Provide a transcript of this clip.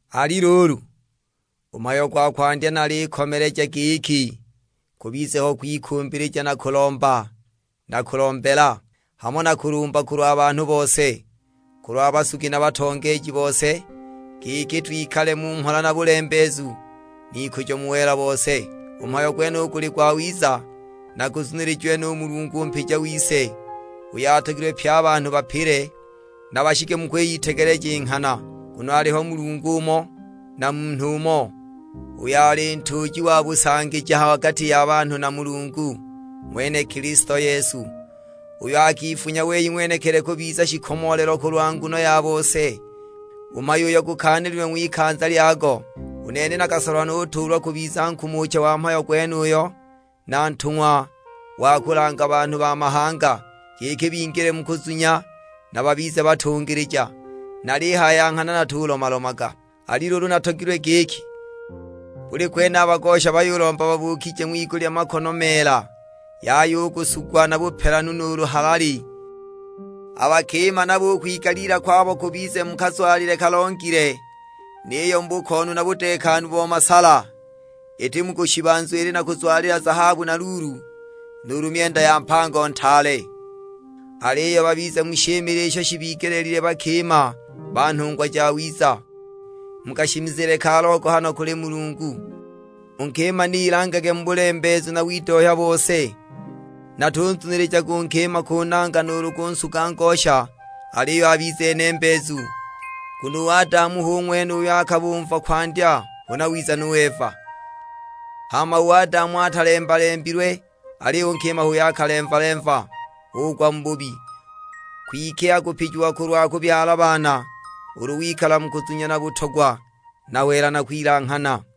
Ali luulu, u mhayo gwa kwandya nalikomeleja giki kubize ho kwikumbilija na kulomba na kulombela, hamo na kulumba kulwa banhu bose. Kulwa basugi na batongeeji bose, giki twikale mu mhola na bulembeezu, n'ikujo mu wela bose. U mhayo gwenuyu guli gwawiza, na guzunilijiwe nu Mulungu u mpija wise, uyo atogilwe pye a banhu bapile, na bashike mu kwiyitegeleja i nghana. Nguno aliho Mulungu umo, na Munhu umo, uyo ali ntuuji wa busangija ha gati ya banhu na Mulungu, ng'wene Kilisto Yesu; uyo akifunya wei ng'wenekili kubiza shikomoolelo kulwa nguno ya bose, mhayo uyo gukaanililwe ng'wikanza lyago. U nene nakasolwa nutuulwa kubiza nkumucha wa mhayo gwenuyo, na ntung'wa wa kulanga banhu ba mahanga; giki bingile mu kuzunya, na babize batungilija; nalihaya ya nghana natulomalomaga. Ali luulu natogilwe giki, buli kwene a bagosha bayulomba babuukije ng'wigulya makono meela, yaya u kusugwa na bupelanu nuulu halali. A bakima nabo u kwigaliila kwabo kubize mu kazwalile kalongile; niyo mu bukoonu na budeekanu bo masala, iti mu kushiba nzwili na kuzwalila zahabu na luulu, nuulu myenda ya mpango ntaale. Aliyo babize mu shimile isho shibigelile bakima ba nhungwa jawiza, mu kashimizile ka logohano kuli Mulungu. U nkima ni ilangage mu bulembeezu na widohya bose. Natunzunilijaga u nkima kunanga nuulu kunsuga ngosha, aliyo abize nembeezu. Nguno u Adamu hu ng'wene uyo akabumva kwandya huna wiza nu Eva. Hama u Adamu atalemba-lembilwe, aliyo u nkima h'uyo akalemva-lemva, ugwa mu bubi. Kwike akupijiwa kulwa kubyala baana, ulu wikala mu kuzunya na butogwa na wela na kwilanghana.